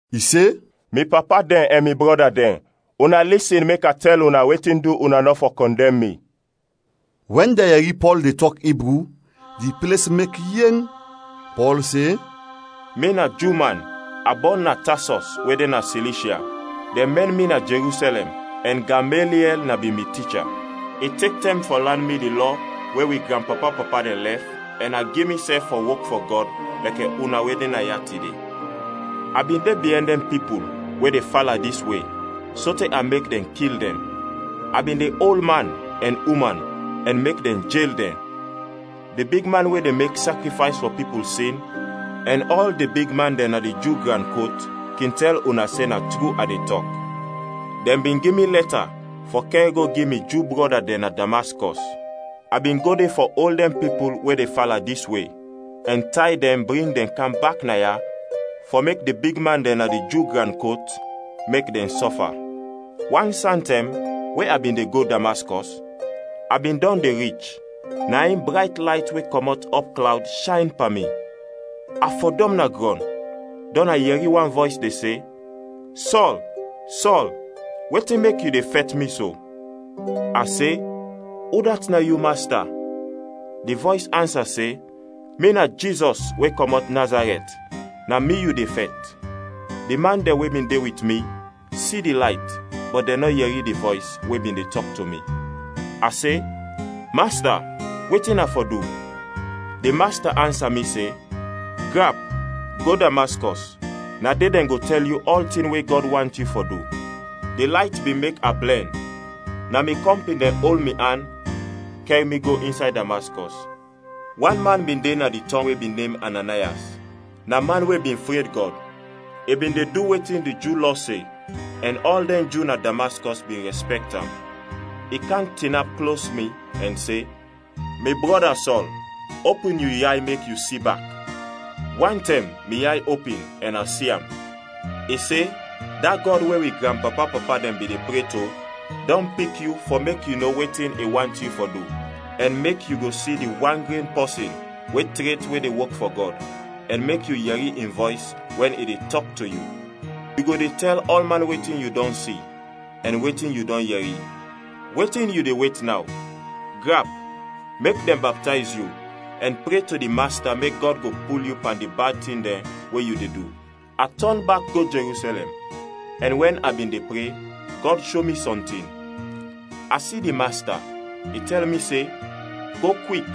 I se, “Mi papa dɛn ɛn mi brɔda dɛn, una lisin mek a tɛl una wetin du una nɔ fɔ kɔndɛm mi!” Wɛn dɛn yɛri Pɔl de tɔk Ibru, di ples mek yeng. Pɔl se, “Mi na Ju man, a bɔn na Tasɔs we de na Silishya. Dɛn mɛn mi na Jerusɛlɛm ɛn Gameliɛl na bin mi ticha. I tek tɛm fɔ lan mi di Lɔ we wi granpapa-papa dɛn lɛf ɛn a gi misɛf fɔ wok fɔ Gɔd lɛkɛ una we de ya tide. A bin de biɛn dɛn pipul we de fala dis We sote a mek dɛn kil dɛn. A bin de ol man ɛn uman ɛn mek dɛn jel dɛn. Di bigman we de mek sakrifays fɔ pipul sin ɛn ɔl di bigman dɛn na di Ju gran kot kin tɛl una se na tru a de tɔk. Dɛn bin gi mi lɛta fɔ kɛr go gi mi Ju brɔda dɛn na Damaskɔs. A bin go de fɔ ol dɛn pipul we de fala dis We ɛn tay dɛn bring dɛn kam bak naya fɔ mek di bigman dɛn na di Ju gran kot mek dɛn sɔfa. “Wan santɛm we a bin de go Damaskɔs, a bin dɔn de rich, na in brayt layt we kɔmɔt ɔpklawd shayn pan mi. A fɔdɔm na grɔn, dɔn a yɛri wan vɔys de se, ‘Sɔl, Sɔl! Wetin mek yu de fɛt Mi so?’ A se, ‘Udat na yu, Masta?’ Di vɔys ansa se, ‘Mi na Jizɔs we kɔmɔt Nazarɛt, na Mi yu de fɛt.’ Di man dɛn we bin de wit mi si di layt bɔt dɛn nɔ yɛri di vɔys we bin de tɔk to mi. A se, ‘Masta, wetin a fɔ du?’ Di Masta ansa mi se, ‘Grap, go Damaskɔs, na de dɛn go tɛl yu ɔltin we Gɔd want yu fɔ du.’ Di layt bin mek a blɛn, na mi kɔmpin dɛn ol mi an kɛr mi go insay Damaskɔs. “Wan man bin de na di tɔng we bin nem Ananayas, na man we bin fred Gɔd, i bin de du wetin di Ju Lɔ se ɛn ɔl dɛn Ju na Damaskɔs bin rɛspɛkt am. I kam tinap klos mi ɛn se, ‘Mi brɔda, Sɔl, opin yu yay mek yu si bak!’ Wantɛm mi yay opin ɛn a si am. I se, ‘Da Gɔd we wi granpapa-papa dɛn bin de pre to dɔn pik yu fɔ mek yu no wetin i want yu fɔ du, ɛn mek yu go si di wan gren Pɔsin we tret we de wok fɔ Gɔd, ɛn mek yu yɛri in vɔys wɛn i de tɔk to yu. Yu go de tɛl ɔlman wetin yu dɔn si ɛn wetin yu dɔn yɛri. Wetin yu de wet naw? Grap, mek dɛn baptayz yu, ɛn pre to di Masta mek Gɔd go pul yu pan di bad tin dɛn we yu de du.’ “A tɔn bak go Jerusɛlɛm ɛn wɛn a bin de pre, Gɔd sho mi sɔntin. A si di Masta; i tɛl mi se, ‘Go kwik,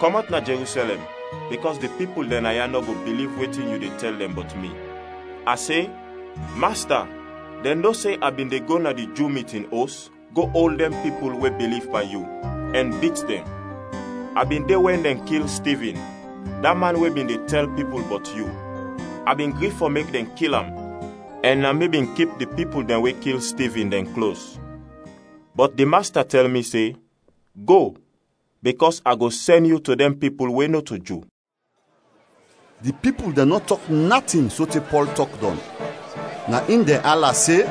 kɔmɔt na Jerusɛlɛm bikɔs di pipul dɛn naya nɔ go biliv wetin yu de tɛl dɛn bɔt mi.’ A se, ‘Masta, dɛn no se a bin de go na di Ju mitin os go ol dɛn pipul we biliv pan Yu ɛn bit dɛn. A bin de wɛn dɛn kil Stivin, da man we bin de tɛl pipul bɔt yu. A bin gri fɔ mek dɛn kil am ɛn na mi bin kip di pipul dɛn we kil Stivin, dɛn klos.’ Bɔt di Masta tɛl mi se, ‘Go, bikɔs a go sɛn yu to dɛn pipul we nɔto Ju.’” Di pipul dɛn nɔ tɔk natin sote Pɔl tɔk dɔn. Na in dɛn ala se,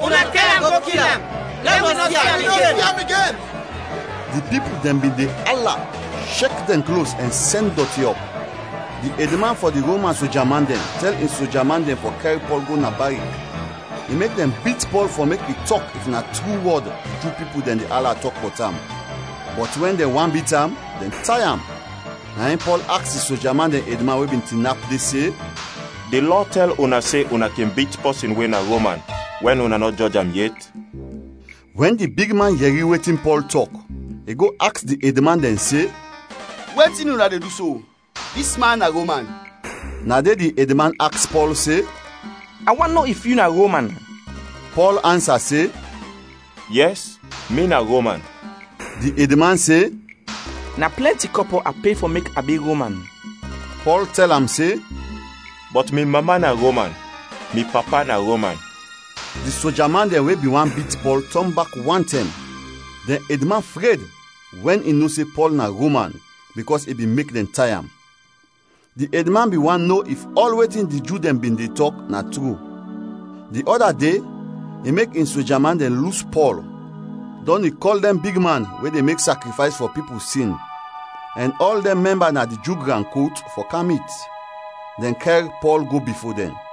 “Una kɛr am go kil am! Lɛ wi nɔ si am igen!” Di pipul dɛn bin de ala, shek dɛn klos, ɛn sɛn dɔti ɔp. Di edman fɔ di Roman soja man dɛn tɛl in soja man dɛn fɔ kɛr Pɔl go na barik, i mek dɛn bit Pɔl fɔ mek i tɔk if na tru wɔd di Ju pipul dɛn de ala tɔk bɔt am. Bɔt wɛn dɛn want bit am, dɛn tay am; na in Pɔl aks di soja man dɛn edman we bin tinap de se, “Di lɔ tɛl una se una kin bit pɔsin we na Roman wɛn una nɔ jɔj am yet?” Wɛn di bigman yɛri wetin Pɔl tɔk, i go aks di edman dɛn se, “Wetin una de du so? Dis man na Roman!” Na de di edman aks Pɔl se, “A want no if yu na Roman.” Pɔl ansa se, “Yɛs, mi na Roman.” Di edman se, “Na plɛnti kɔpɔ a pe fɔ mek a bi Roman.” Pɔl tɛl am se, “Bɔt mi mama na Roman; mi papa na Roman.” Di soja man dɛn we bin want bit Pɔl tɔn bak wantɛm. Dɛn edman fred wɛn i no se Pɔl na Roman bikɔs i bin mek dɛn tay am. Di edman bin want no if ɔl wetin di Ju dɛn bin de tɔk na tru. Di ɔda de i mek in soja man dɛn lus Pɔl, dɔn i kɔl dɛn bigman we de mek sakrifays fɔ pipul sin ɛn ɔl dɛn mɛmba na di Ju gran kot fɔ kam mit. Dɛn kɛr Pɔl go bifo dɛn.